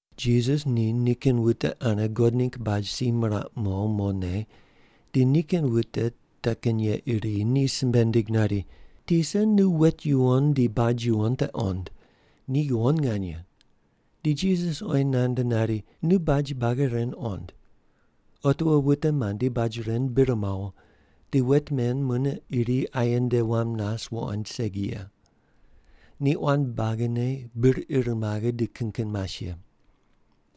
Jisas ni nikin wute ane God ningg baj si miraq mo mone di nikin wute te kin ye iri ni simbe nindig nari, “Tisa, nu wet yuwon di baj yuwon te qond. Ni yuwon nganye.” Di Jisas oyi nand nari, “Nu baj buagi ren qond. Otiwo wute mandi baj ren bir mawo di wet men mune iri aye nde wam nas wuqoind segi ye. Ni quan buagine bir ir maghe di kin kin mas ye.”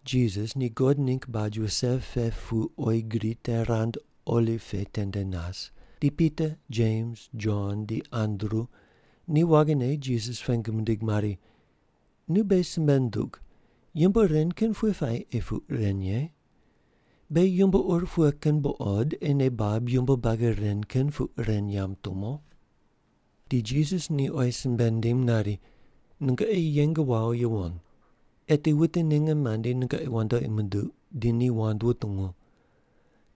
Jisas ni God ningg baj wuse pe pu oyi gri te rand oliv pe tende nas, di Pita, Jems, Jon, di Andru ni waghine Jisas pengu mindig mari, “Nu beghi simbe ndug, yumbo ren kin pughe puayi ei puq ren ye? Beghi yumbo ur pughe kin buqod ei nei bab yumbo buagi ren kin puq ren yamb tumo?” Di Jisas ni oyi simbe nindim nari, “Nungoqi yeng wawo yuwon. Eti wute ninge mandi nungoqi wandoqi munduq di ni wand wutungu.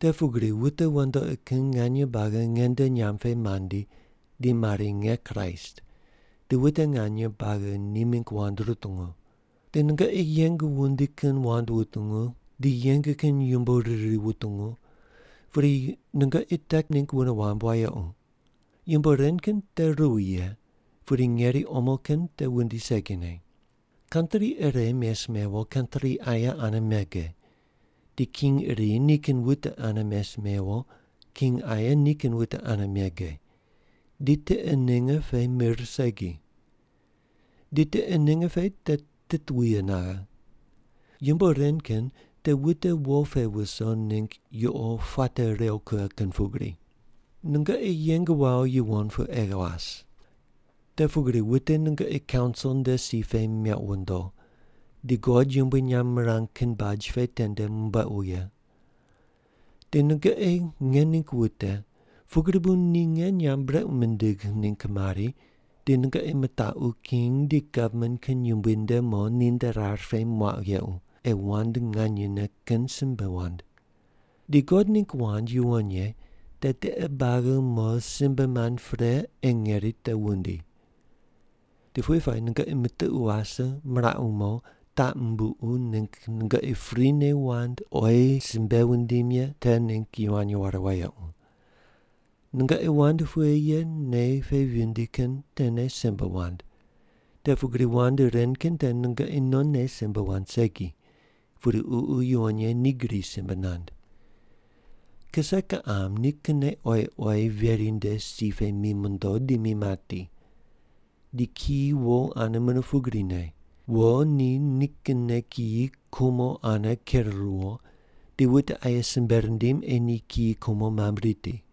Te pugri wute wandoqi kin nganye buagi nge nde nyamb pe mandi di mari, ‘Nge Kraist’ di wute nganye buagi ni mingg wand rutungu. Di nungoqi yeng wundi kin wand wutungu di yeng kin yumbo riri wutungu, pudi nungoqi te ningg wune wamb wayequ. Yumbo ren kin te ruwi ye, pudi ngeri omo kin te wundi segine. Kantri ire mes mewo kantri aye ane mege, di king iri nikin wute ane mes mewo king aye nikin wute ane mege, di tiqe ninge pe mir segi. Di tiqe ninge pe te titwuye naghe. Yumbo ren kin te wute wo pe wuso ningg yuqo puate rew kughe kin pugri. “Nungoqi yeng wawo yuwon pu ei was. Te pugri wute nungoqi kaunsil nde si pe mequ wondo, di God yumbui nyamb mirang kin baj pe tende mumbuequ ye. Di nungoqi nge ningg wute pugri bu ni nge nyamb brequ mindigh ningg mari di nungoqi mitaqu king di gavman kin yumbui nde mo ninde rar pe muaqu yequ, ei wand nganyene kin simbe wand. Di God ningg wand yuwon ye te tiqe buagi mo simbe mand pre ei ngeri te wundi. Di pughe puayi nungoqi mitiqu wase miraqu mo taq mumbuqu ningg nungoqi prine wand oyi simbe wundim ye te ningg yivany ware wayequ. Nungoqi wand pughe ye nei pe vindi kin tene simbe wand, te pugri wand ren kin te nungoqi nonne simbe wand segi, pudi Ququ Yuwon Ye ni gri simbe nand. “Kise kiqam ni kinne oyi oyi veri nde si pe mi mondo di mi mati. Di kiyi wo ane mune pugrine. Wo ni nikinne kiyi kumo ane ker ruwo di wute aye simbe rindim ei ni kiyi kumo mamb riti.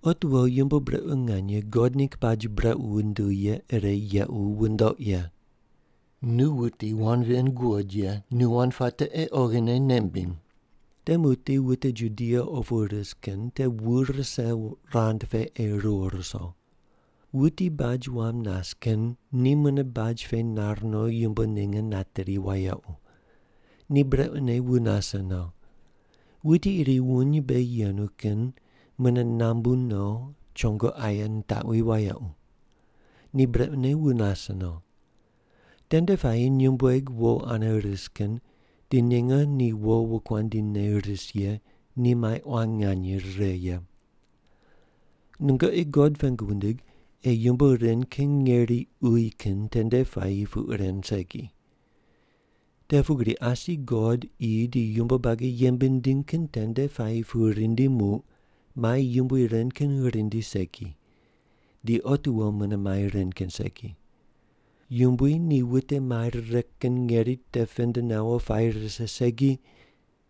“Otiwo yumbo brequ nganye God ningg baj brequ wunduw ye ire yequ wundoq ye.” (Nu wuti wand ven guqod ye nu wand puate ei oghine nei mbiny.) “Te muqdi wute Judia opu ris kin te wu rise rand pe ei riwo ruso. Wuti baj wam nas kin ni mune baj pe nar no yumbo ninge nateri wayequ. Ni brequne wu nase no. Wuti iri wuny mbe yenu kin mune nambu no chongo aye nitaqwi wayequ. Ni brequne wu nase no. Tende puayi nyumbueg wo ane ris kin di ninge ni wo wokuandi ne ris ye ni mai quan nganye rire ye. Nungoqi God pengu wundig ei yumbo ren kin ngeri uyi kin tende puayi puq ren segi. Te pugri asi God qi di yumbo buagi yembe nindiny kin tende puayi pu rindi muq mai yumbui ren kin rindi segi. Di otiwo mune mai ren kin segi. Yumbui ni wute mai rire kin ngeri te pend nawo puayi rise segi,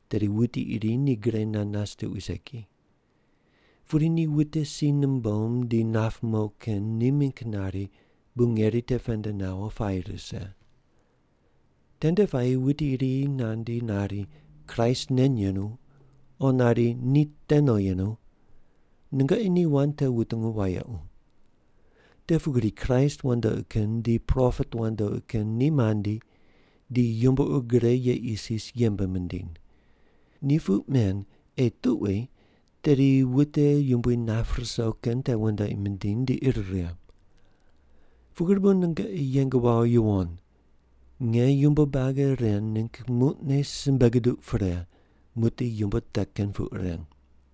tedi wuti iri ni gre nand nas tuqui segi. Pudi ni wute si numbom di nap mo kin ni mingg nari bu ngeri te pend nawo puayi rise. Tende puayi wuti iri nandi nari, ‘Kraist nen yenu,’ o nari, ‘Ni te no yenu.’ Nungoqi ni wand te wutungu wayequ. Te pugri Kraist wandoqi kin di propet wandoqi kin ni mandi di yumbo ur gre ye isis yembe mindiny. Ni puq men ei tuqui tedi wute Yumbui nap ruso kin te wandoqi mindiny di ir righe. Pugri bu nungoqi yeng wawo yuwon. Nge yumbo buagi ren ningg muqne simbe guduq pre muqdi yumbo te kin puq ren.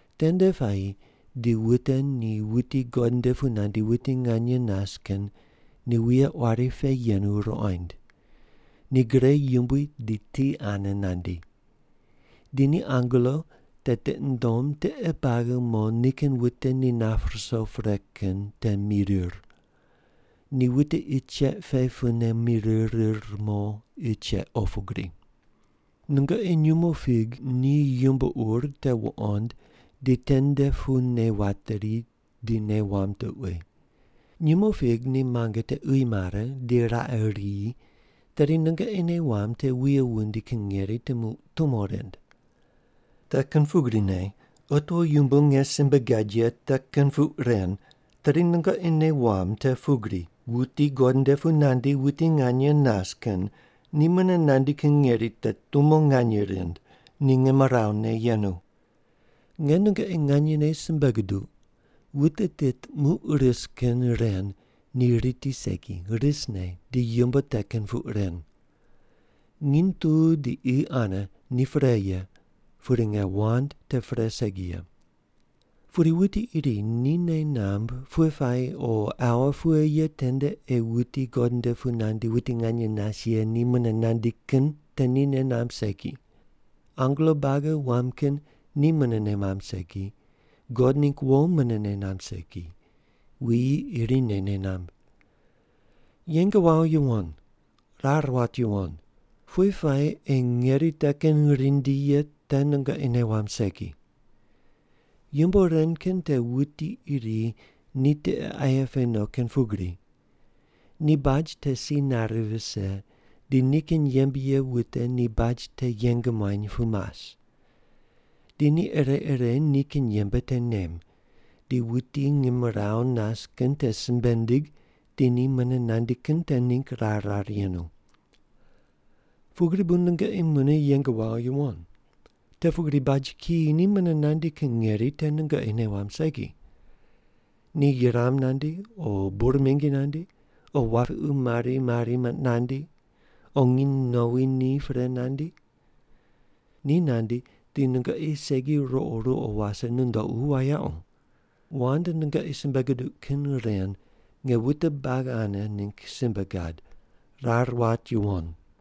Tende puayi di wute ni wuti God nde pu nandi wuti nganye nas kin ni wuye quari pe yenu ruqoind. Ni gre yumbui di ti ane nandi. Di ni angelo te tiqi nundom tiqe buagi mo nikin wute ni nap ruso pre kin te mirir. Ni wute qi cheq pe pune mirir rir mo qi cheq opu gri. “Nungoqi nyumo fig ni yumbo ur te wuqond di tende pu nei wateri di nei wamb tuqui. Nyumo fig ni muange te uyi mare di raqe riyi tedi nungoqi nei wamb te wuye wundi kin ngeri te muq tumo rind. Te kin pugrine otiwo yumbo nge simbe gad ye te kin puq ren, tedi nungoqi nei wamb te pugri wuti God nde pu nandi wuti nganye nas kin ni mune nandi kin ngeri te tumo nganye rind, ni ngimrawu ne yenu. Nge nungoqi nganyene simbe guduq, wute tit muq ris kin ren ni riti segi, risne di yumbo te kin puq ren. Nginy tu di qi ane ni pre ye, pudi nge wand te pre segi ye. “Pudi wuti iri ni nei namb pughe puayi o aua pughe ye tende ei wuti God nde pu nandi wuti nganye nas ye ni mune nandi kin te ni nei namb segi. Angelo buagi wam kin ni mune nei mamb segi, God ningg wo mune nei namb segi, wuyi irine nei namb. Yeng wawo yuwon. Rar wat yuwon. Pughe puayi ei ngeri te kin rindi ye te nungoqi nei wamb segi. Yumbo ren kin te wuti iri ni tiqe aye pe no kin pugri. Ni baj te si nare vise di nikin yembe ye wute ni baj te yeng muany pu mas. Di ni ire ire nikin yembe te nem, di wuti ngimrawu nas kin te simbe nindig di ni mune nandi kin te ningg rar rar yenu. Pugri bu nungoqi mune yeng wawo yuwon, te pugri baj kiyi ni mune nandi kin ngeri te nungoqi nei wamb segi. Ni yuram nandi, o bur mingi nandi, o wapiqu mari mari nandi, o nginy nowi ni pre nandi. Ni nandi di nungoqi segi ruqo ruqo wase nundoqu wayequ. Wand nungoqi simbe guduq kin ren nge wute buagi ane ningg simbe gad. Rar wat yuwon.”